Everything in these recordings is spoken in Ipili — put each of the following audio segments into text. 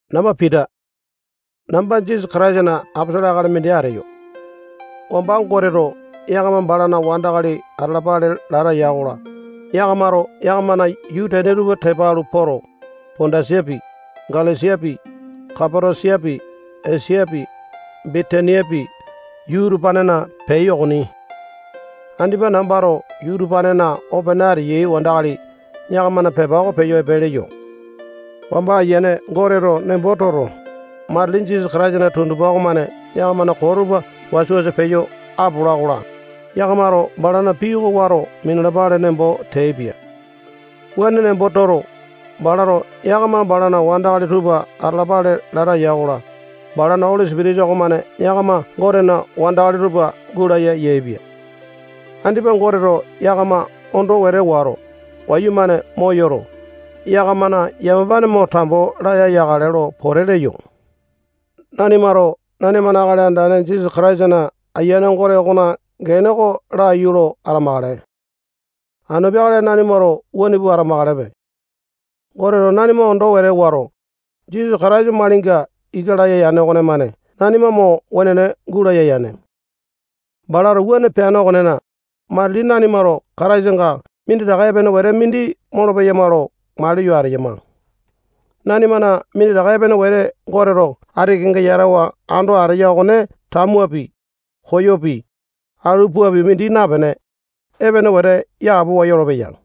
Namba Pita. Namba Jisasa Kataisana aposolo akali mindi ateyo. Wamba Goteto yakama balana wandakali atalapale lata ya-kola, yakamato yakamana yuu tene tupa tepa alu poto, Pondasapi, Galesiapi, Kapatosiapi, Esiapi, Bitiniapi, yuu utupanena peai okoni. Andipa nambato yuu utupanena opene ateyai wandakali yakamana pepa oko peyo epe leyo. Wamba Ayiane Goteto nembo toto, matili Jisasa Kataisana tundupa okomane yakamana koo tupa wasa-wasa peyo apola-kola, yakamato balana pii oko wato minalapale nembo teaipia. Wuane nembo toto, balato yakama balana wandakali tupa atalapale lata ya-kola, balana Oli Sipitisa okomane yakama Gotena wandakali tupa gulaya yaepia. Andipa Goteto yakama ondo wete wato, wayumane moyoto, yakamana yamapane mo tambo laya yakale lo pote leyo. Nanimato nanimana Akali Andane Jisasa Kataisana Ayiane Gote okona gene oko laiyu lo atamakale. Anu peakale nanimato wuane pua atamakalepe. Goteto nanima ondo wete wato, Jisasa Kataisa malinga ika laya yane okonemane nanima mo wenene gulaya yane. Balato wuane peane okonena, matili nanimato Kataisanga minditaka epene wete mindi molopeyama lo maliyo ateyama. Nanimana minditaka epene wete Goteto ati kenga yatawa ando ateya okone tamuapi, koyopi, alu puapi mindi napene, epene wete yapowa yolopeya.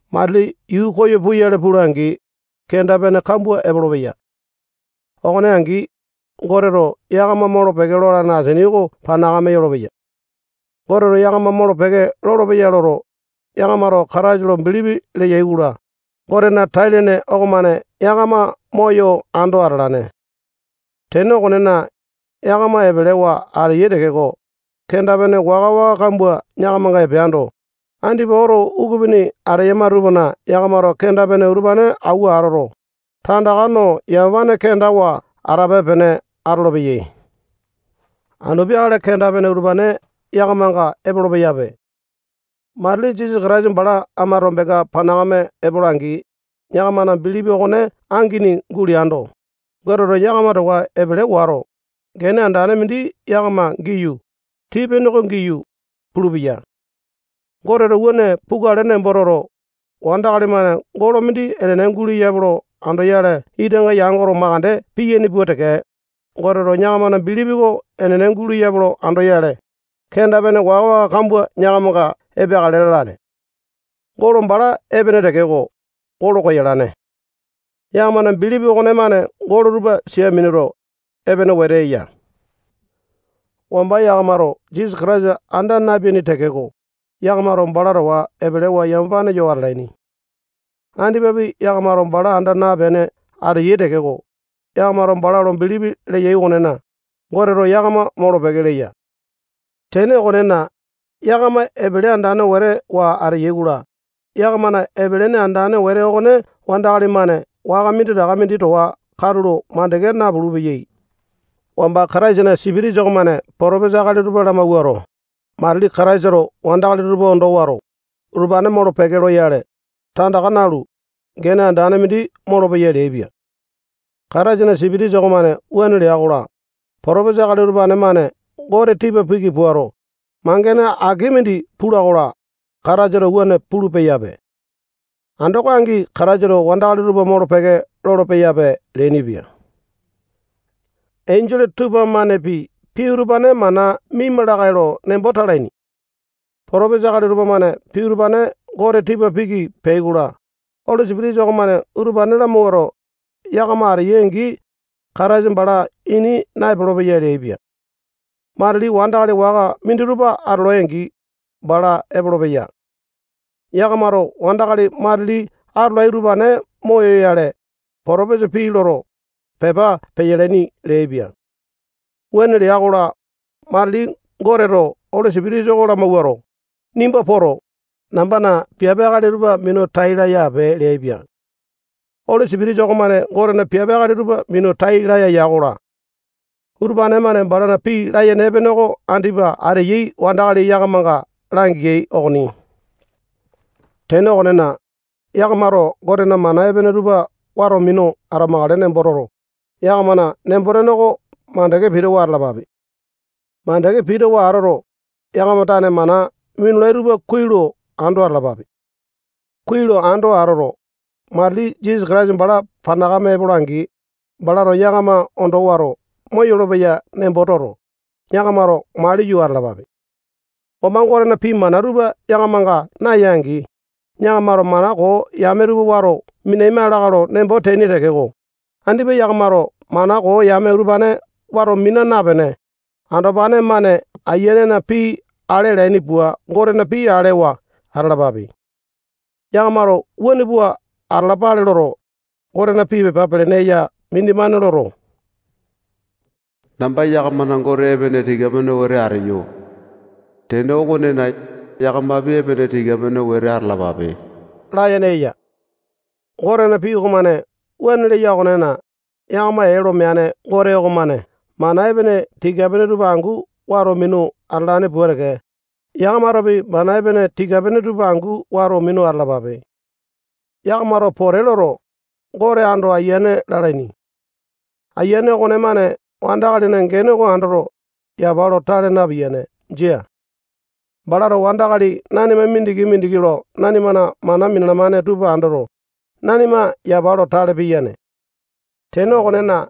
Matili yuu koyo puyale pula-angi, kenda-pene kambua epolopeya. Okone angi, Goteto yakama molo-peke lolane asini oko panakame yolopeya. Goteto yakama molo-peke lolopeya loto, yakamato Kataisa lo bilipi leyai-kola, Gotena tai-lene okomane yakama moyo ando atalane. Tene okonena, yakama epelewa ateyai tekeko, kenda-pene waka-waka kambua yakamanga epeando, andipa oto ukupini ateyama tupana yakamato kenda-pene utupane awua atoto, tandaka no yamapane kendawa atape-pene atolopeyai. Anu peakale kenda-pene utupane yakamanga epolo-peyape. Matili Jisasa Kataisa bala ama tombenga panakame epola-angi, yakamana bilipi okone angini guleando, Goteto yakama towa epele wato, gene andane mindi yakama giyu, tii-pene oko giyu, pulupeya. Goteto wuane pukale nembo toto, wandakali-mane golo mindi enene guleyape lo andoyale itanga yangoto makande piyaini pua teke, Goteto yakamana bilipi oko enene guleyape lo andoyale, kenda-pene waka-waka kambua yakamanga epeakale lalane. Golo bala epene tekeko, golo koyalane. Yakamana bilipi okonemane golo tupa sia minuto, epene wete eya. Wamba yakamato Jisasa Kataisa anda napeaini tekeko, yakamato bala towa epelewa yamapane yo atalaini. Andipapi yakamato bala anda napene ateyai tekeko, yakamato bala lo bilipi leyai okonena, Goteto yakama molo-peke leya. Tene okonena, yakama epele andane wete wa ateyai-kola, yakamana epele ene andane wete okone wandakali-mane waka minditaka mindi towa katulo mandeke napulu-peyai. Wamba Kataisana Sipitisa okomane potopesa akali tupa lamawuato, matili Kataisato wandakali tupa ondo wato, utupane molo-peke loyale, tandaka nalu, gene andane mindi molopeya leaipia. Kataisana Sipitisa okomane wuane lea-kola, potopesa akali utupane-mane Gote tipa piki puato, mangene aki mindi pula-kola, Kataisato wuane pulu-peyape. Andoko angi Kataisato wandakali tupa molo-peke lolo-peyape leainipia. Enjole tupamanepi pii utupane mana miaima lakae lo nembo talaini. Potopesa akali tupamane pii utupane Gote tipa piki peai-kola, Oli Sipitisa okomane utupane lamawuato, yakama ateyai-angi, Kataisa bala ini naepolo-peya leaipia. Matili wandakali waka minditupa atolai-angi, bala epolopeya. Yakamato wandakali matili atolai utupane moyoyale, potopesa pii loto, pepa peyalaini leaipia. Wuane lea-kola, matili Goteto Oli Sipitisa oko lamawuato, nimba poto, nambana piape akali tupa minu tai laya ape leaipia. Oli Sipitisa okomane Gotena piape akali tupa minu tai laya ya-kola, utupane-mane balana pii layene epene oko andipa ateyai wandakali yakamanga langeai okoni. Tene okonena, yakamato Gotena mana epene tupa wato minu atamakale nembo toto, yakamana nembo-tene oko mandeke pitawa atalapape. Mandeke pitawa atoto, yakama tane mana minulai tupa kuai lo ando atalapape. Kuai lo ando atoto, matili Jisasa Kataisa bala panakame epola-angi, balato yakama ondo wato moyolo-peya nembo toto, yakamato maliyo atalapape. Wamba Gotena pii mana tupa yakamanga naya-angi, yakamato mana koo yame tupa wato minaima lakae lo nembo teaini tekeko, andipa yakamato mana koo yame utupane wato mina napene, andopane-mane ayianena pii ale alaini pua Gotena pii alewa atalapape. Yakamato wuane pua atalapale loto, Gotena pii pepa pelene eya mindimane loto, namba yakamana Gote epene tika-pene wete ateyo. Tene okonena, yakamapi epene tika-pene wete atalapape layene eya. Gotena pii okomane wuane leya okonena, yakama ee lo meane Gote okomane mana epene tika-pene tupa angu wato minu atalane pua teke, yakamatopi mana epene tika-pene tupa angu wato minu atalapape. Yakamato pote loto, Gote ando Ayiane lalaini. Ayiane okonemane wandakalina gene oko andoto, yapa lo tale napiyane. Jia. Balato wandakali nanima mindiki-mindiki lo nanimana mana minalamane tupa andoto, nanima yapa lo tale piyane. Tene okonena,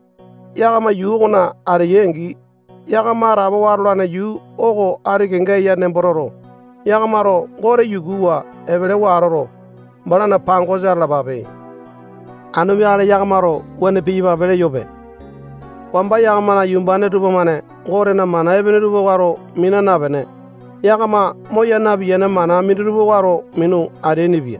yakama yuu okona ateyai-angi, yakama atapowa atolane yuu oko ati kenga eya nembo toto, yakamato Gote yukuwa epelewa atoto, balana pangosa atalapape. Anu peakale yakamato wuane piyapape leyope. Wamba yakamana yumbane tupamane Gotena mana epene tupa wato mina napene, yakama moya napiyane mana minditupa wato minu ateainipia.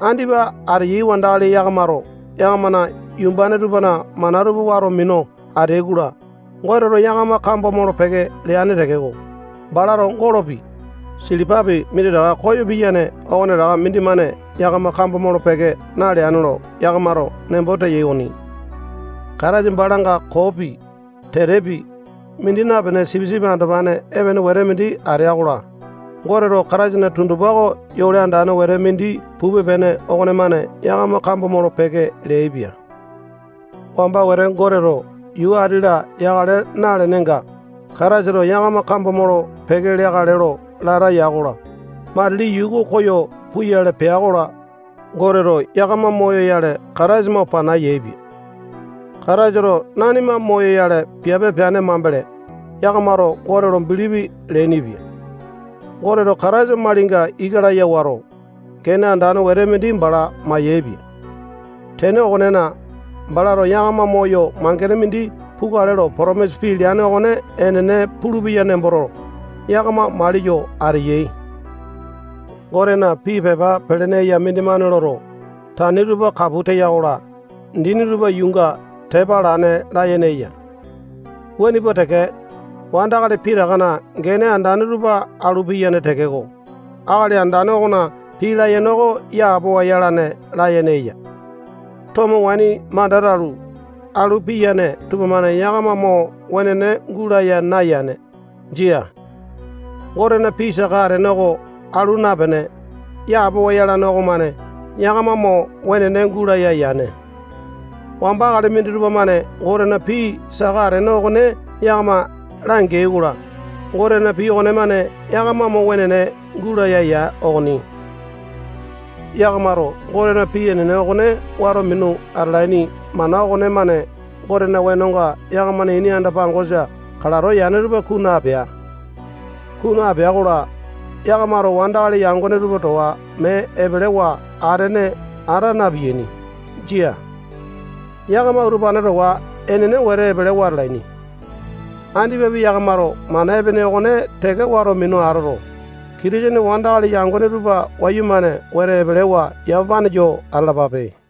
Andipa ateyai wandakali yakamato yakamana yumbane tupana mana tupa wato minu ateai-kola, Goteto yakama kambo molo-peke leane tekeko, balato golopi, silipapi minditaka koyo piyane okonetaka mindimane yakama kambo molo-peke naleane lo yakamato nembo teyai okoni. Kataisa balanga koopi, tetepi, mindi napene sipisipi andopane epene wete mindi atea-kola, Goteto Kataisana tundupa oko yole andane wete pupe-pene okonemane yakama kambo molo-peke leaipia. Wamba wete Goteto yuu ati-la yakale nalenenga, Kataisato yakama kambo molo-peke leakale lo lata ya-kola, matili yuu oko koyo puyale pea-kola, Goteto yakama moyoyale Kataisa mo pana yaepia. Kataisato nanimana moyoyale piape peane mambele, yakamato Gote lo bilipi leainipia. Goteto Kataisa malinga ika laya wato, gene andane wete mindi bala mayaepia. Tene okonena, balato yakama moyo mangene mindi pukale lo potomisa pii leane okone enene pulupeya nemboto, yakama maliyo ateyai. Gotena pii pepa pelene eya mindimane loto, tani tupa kapu teya-kola, dini tupa yuunga tepa alane layene eya. Wuane pua teke, wandakali pitakana gene andane tupa alu piyane tekeko, Akali Andane okona pii layene oko yapowa yalane layene eya. Tomo waini manda talu, alu piyane tupamane yakama mo wenene gulaya nayane. Jia. Gotena pii saka atene oko alu napene, yapowa yalane okomane yakama mo wenene gulaya yane. Wamba akali minditupa-mane Gotena pii saka atene okone yakama langea-kola, Gotena pii okonemane yakama mo wenene gulaya ya okoni. Yakamato Gotena pii enene okone wato minu atalaini mana okonemane Gotena wenonga yakamana ini anda-pangosa kalato yane tupa kunu apea. Kunu apea-kola, yakamato wandakali yangone tupa towa mee epelewa atene ata napiyaini. Jia yakama utupane towa enene wete epelewa atalaini. Andipapi yakamato mana epene okone teke wato minu atoto, Kitisene wandakali yangone tupa wayumane wete epelewa yamapane yo atalapape.